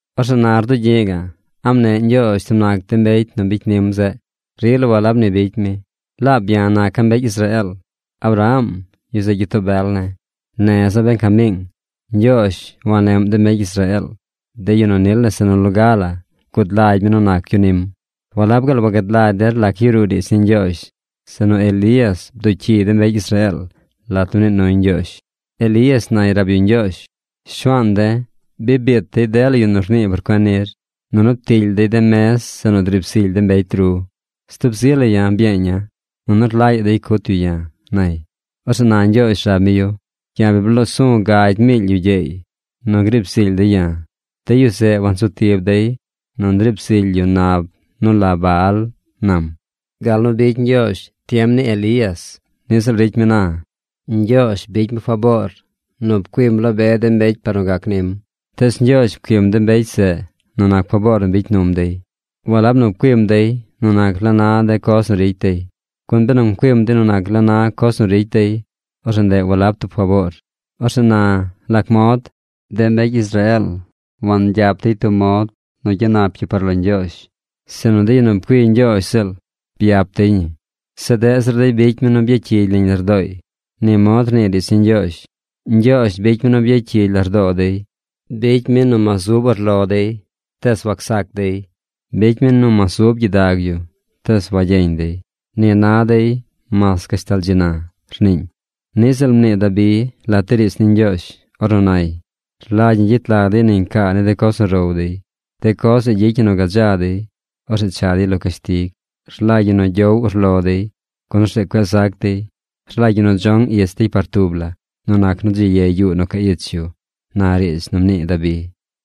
Orzeꞌ na rdugyi̱ꞌ ga̱ꞌ: ¿a mneꞌ Ñgyoozh tub nac de mbecy nu bicy nim zeꞌ? ¡Rila walab ni bicy mi! Laab ya̱ naca̱ mbecy Israeel. Abraham, yu zeꞌ gyitoo bel ne̱. Neza̱ Benjamiing. Ñgyoozh wanneꞌm de mbecy Israeel, de yu nu nil nese nu loga la gud lagy mi nu nac yu nim. ¿Walab gaal wagad lagy der lac yaruu riidz ni Ñgyoozh zeꞌ nu Elías bduꞌ cyiy de mbecy Israeel lat nu mnii nuy Ñgyoozh? Elías nay rab yu Ñgyoozh: “Shuaan de̱, bi biit dey dela yu nu rnii por cuen nir, nunu ptily dey de mez zeꞌ nu driib zily de mbecy ru. Stub zi la ya̱ byeeña̱, nunu rlagyaꞌ dey cut yu ya̱”, nay. Orzeꞌ na Ñgyoozh rab mi yu: “Ya̱ bi bloo su̱ gagy miily yu gyeey nu griib zily dey ya̱. De yu zeꞌ wansu tib dey nu nriib zily yu nab nu la Baal”, nam. Gal nu bicy Ñgyoozh tiem ni Elías, niꞌ ziꞌl ricy mi na. Ñgyoozh bicy mi faboor nu pcuim la be de mbecy par nu gac nim. Tees Ñgyoozh pcuim de mbecy zeꞌ nu nac faboor nu bicy num dey. Walab nu pcuim dey nu nac la na de coz nu ricy dey. Gun benu ncuim dey nu nac la na coz nu ricy dey, orzeꞌ ndeꞌ walab tub faboor. Orzeꞌ na ¿lac mod? De mbecy Israeel wangyad dey tub mod nu gyanap yu par lo Ñgyoozh, sinu de yu nu pcui Ñgyoozh ziꞌl byap dey ñi. Zeꞌ deꞌ zir dey bicy mi nu byacyigy nañ lardooy. Ni mod rnii riidz ni Ñgyoozh: “Ñgyoozh bicy mi nu byacyigy lardoo dey. Bicy mi nu mas zub urlo dey tees wacsac dey. Bicy mi nu mas zub gyidag yu, tees wagyeñ dey. Ni na dey mas gashtal dzi na”, rniiñ. Niꞌ ziꞌl mnii Dabi lat de riidz ni Ñgyoozh ornu nay: Rlagy ñi gyet lag dey nañ caa ni de coz nu row dey. De coz zeꞌ gyicy ñi nu gadza dey. Orzeꞌ cha dey lo cashtig. Rlagy ñi nu gyow urlo dey, gun orzeꞌ cueꞌ zac dey. Rlagy ñi dzong ich dey par tub la nu nac nu dzi ye yuu nu ca ich yu, na riidz nu mnii Dabi.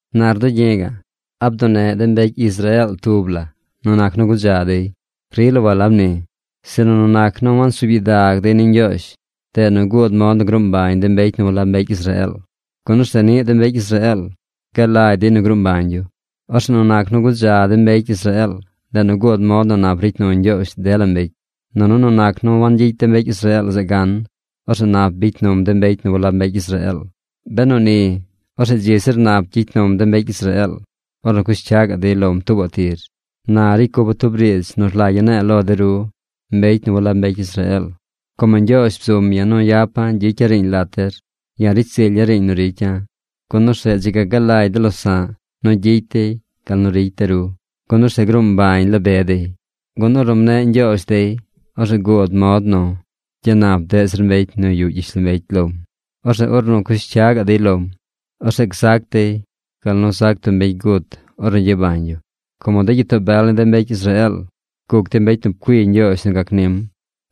Na rdugyi̱ꞌ ga̱ꞌ: ¿A bduneꞌ de mbecy Israeel tub la nu nac nu gudza dey? ¡Rila walab ni! Sinu nu nac nu wansuub gyidag dey ni Ñgyoozh, ndeꞌ nu guud mod nu gruu mbañ de mbecy nu walab mbecy Israeel, gun orzeꞌ niꞌ de mbecy Israeel galagy dey nu gruu mbañ yu. Orzeꞌ nu nac nu gudza de mbecy Israeel, ndeꞌ nu guud mod nu nap ricy nu Ñgyoozh dela mbecy. Nunu nu nac nu wangyicy de mbecy Israeel zeꞌ gan, orzeꞌ nap bicy num de mbecy nu walab mbecy Israeel. ¡Benu ni, orzeꞌ dzi zir nap gyicy num de mbecy Israeel ornu cush cya gaꞌ dey lom tuubaꞌ tir! Na ricy cupa̱ tub riidz nu rlagya̱ ne̱e̱ lo de ru, mbecy nu walab mbecy Israeel. Como Ñgyoozh bzum ya̱ nu yapa̱ gyicya̱ riiñ lat der, ya̱ ricy zilya̱ riiñ nu ricya̱, gun orzeꞌ dzi ga galagy de losa̱ꞌ nu gyicy dey gal nu ricy de ru, gun orzeꞌ gruu mbañ la be dey. Gun ornu mneꞌ Ñgyoozh dey, orzeꞌ guud mod nu gyanap deꞌ zir mbecy nu yuꞌ gyishlombecy lom. Orzeꞌ ornu cush cya gaꞌ dey lom, orzeꞌ gzac dey gal nu zac tub mbecy gut ornu gyabañ yu. Como de gyitoo bel ni de mbecy Israeel guc dey mbecy nu pcui Ñgyoozh nu gac nim,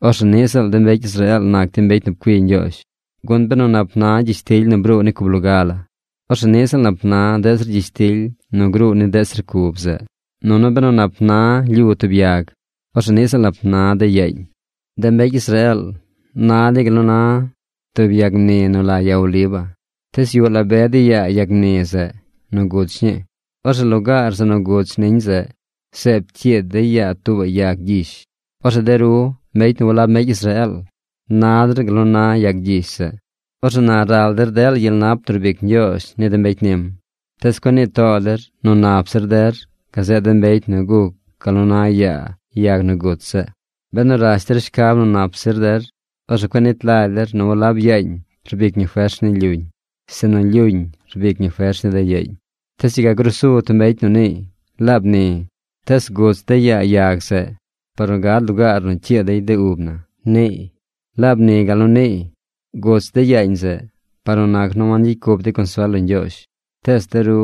orzeꞌ niꞌ ziꞌl de mbecy Israeel nac dey mbecy nu pcui Ñgyoozh. Gun benu nap na gyishtily nu bruu ni cub loga la, orzeꞌ niꞌ ziꞌl nap na deꞌ zir gyishtily nu gruu ni deꞌ zir cub zeꞌ. Nunu benu nap na lyu tub yag, orzeꞌ niꞌ ziꞌl nap na de yaañ. De mbecy Israeel na dey gal nu na tub yag mni nu la ya oliva. Tees yuꞌ la be de yaa yag mni zeꞌ nu guch ñii. Orzeꞌ lugaar zeꞌ nu guch niñ zeꞌ, zeꞌ pcyiid dey yaa tubaꞌ yag gyish. Orzeꞌ de ru, mbecy nu walab mbecy Israeel, na der gal nu na yag gyish zeꞌ. Orzeꞌ na ral der dela gyel nap nu rbic Ñgyoozh ni de mbecy nim. Tees cueꞌ nii too der nu nap zir der gazeꞌ de mbecy nu guc gal nu na yaa yag nu guch zeꞌ. Benu rash der shcab nu nap zir der, orzeꞌ cueꞌ nit lagy der nu walab yaañ rbic ñi fers ni lyuñ, sinu lyuñ rbic ñi fers ni de yaañ. Tees dzi ga grusu tub mbecy nu niiy: “Laab ni, tees guch de yaa yag zeꞌ par nu gad lugaar nu cyiid dey de ub na”, niiy. Laab ni gal nu niiy. Guch de yaañ zeꞌ par nu nac nu wangyicy cup dey consuel lo Ñgyoozh. Tees de ru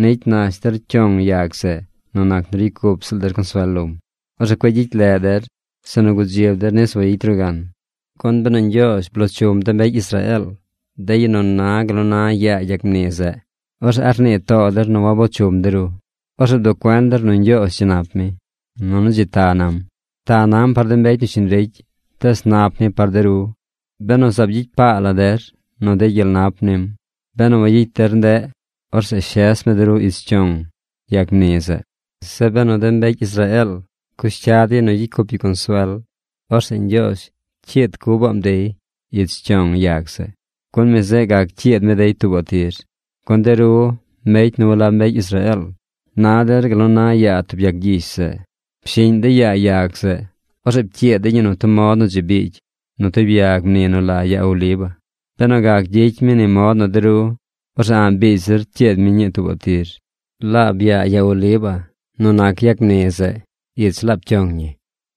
nicy nash der cyong yag zeꞌ nu nac nu ricy cup ziꞌl der consuel lom. Orzeꞌ cueꞌ gyicy leꞌ der, sinu gudzib der nis wagyicy ru gan. Gun benu Ñgyoozh bloo chum de mbecy Israeel, de yu nu na gal nu na yaa yag mni zeꞌ, orzeꞌ ¿a rnii too der nu wabo chum de ru? Orzeꞌ bduꞌ cuen der nu Ñgyoozh dzi nap mi, nunu dzi ta nam. Ta nam par de mbecy nu shiñ ricy. Tees nap mi par de ru, benu zaab gyicy paa la der nu de gyel nap nim. Benu wayicy der ndeꞌ, orzeꞌ shes mi de ru ich cyoong yag mni zeꞌ. Zeꞌ benu de mbecy Israeel, cush cya dey nu gyicy cup yu consuel, orzeꞌ Ñgyoozh cyiid cubaꞌm dey ich cyoong yag zeꞌ, gun mi zeꞌ gac cyiid mi dey tuubaꞌ tir. Gun de ru, mbecy nu walab mbecy Israeel, na der gal nu na yaa tub yag gyish zeꞌ. Pshiꞌñ dey yaa yag zeꞌ. Orzeꞌ pcyiid dey ñi nu tub mod nu dzi biigy nu tub yag mni nu la ya oliva. ¡Benu gac gyicy mi ni mod nu de ru, orzeꞌ a̱ꞌ biigy zir cyiid mi ñii tuubaꞌ tir, laab yaa ya oliva nu nac yag mni zeꞌ ich laab cyong ñi!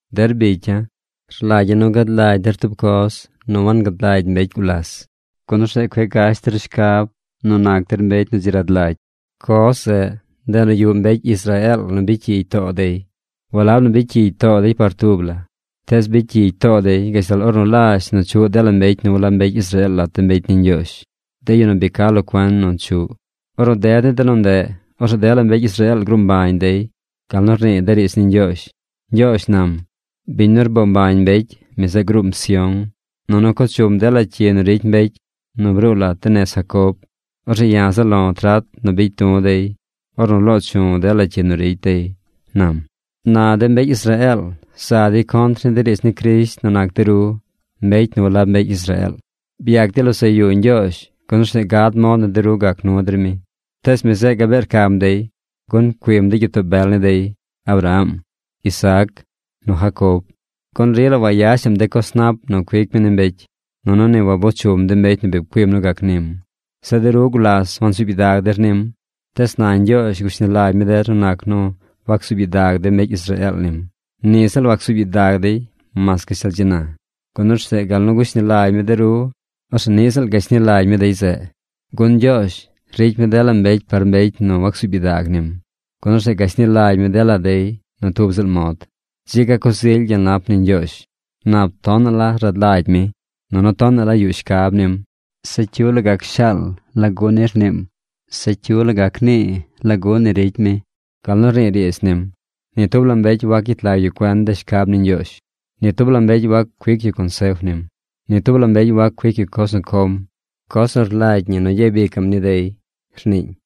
Der bicya̱, rlagya̱ nu gad lagy der tub coz nu wangad lagy mbecy gulas, gun orzeꞌ cueꞌ gash der shcab nu nac der mbecy nu dzi rad lagy. Coz zeꞌ, ndeꞌ nu yuꞌ mbecy Israeel nu bicy cyigy too dey. Walab nu bicy cyig too dey par tub la, tees bicy cyig too dey gashtal ornu lazh nu chuꞌ dela mbecy nu walab mbecy Israeel lat de mbecy ni Ñgyoozh, de yu nu bi ca lo cuen nu chuꞌ. Ornu ded ni de nu ndeꞌ, orzeꞌ dela mbecy Israeel gruu mbañ dey gal nu rnii de riidz ni Ñgyoozh. Ñgyoozh nam: Biñ nu rboo mbañ mbecy, mi zeꞌ gruum Sión nunu co chum dela cyi nu ricy mbecy nu bruu lat de nez Jacob. Orzeꞌ ya̱ zaꞌ lo̱ trat nu bicy du̱ dey ornu lo̱o̱ chu dela cyi nu ricy dey, nam. Na de mbecy Israeel za dey contr ni de riidz ni Crisht nu nac de ru, mbecy nu walab mbecy Israeel. Byac dey losaꞌ yuu Ñgyoozh, gun orzeꞌ gad mod nu de ru gac nu der mi. Tees mi zeꞌ gabee rcam dey, gun pcuim de gyitoo bel ni dey, Abraham, Isaac, nu Jacob. Gun rila wayashaꞌm de coz nap nu cuic mi ni mbecy, nunu ni wabo chum de mbecy nu bi pcuim nu gac nim. Zeꞌ de ru gulas wansuub gyidag der nim. Tees na Ñgyoozh gushni lagy mi der nu nac nu wacsuub gyidag de mbecy Israeel nim. Ni ziꞌl wacsuub gyidag dey mas gashtal dzi na, gun orzeꞌ gal nu gushni lagy Ñgyoozh de ru, orzeꞌ niꞌ ziꞌl gashni lagy mi dey zeꞌ. Gun Ñgyoozh ricy mi dela mbecy par mbecy nu wacsuub gyidag nim, gun orzeꞌ gashni lagy mi dela dey nu tub ziꞌl mod. ¡Dzi ga coz ily gyel nap ni Ñgyoozh! ¡Nap tonaꞌ la rad lagy mi! ¡Nunu tonaꞌ la yuꞌ shcab nim! Se cyu la gac shaal lagu nu ni rniim. Se cyu la gac nii lagu ni ricy mi. Gal nu rnii riidz nim: Ni tub la mbecy wac gyet lag yu cuen de shcab ni Ñgyoozh. Ni tub la mbecy wac cuic yu consef nim. Ni tub la mbecy wac cuic yu coz nu com, coz nu rlagy ñi nu gyabicaꞌm ni dey, rniiñ.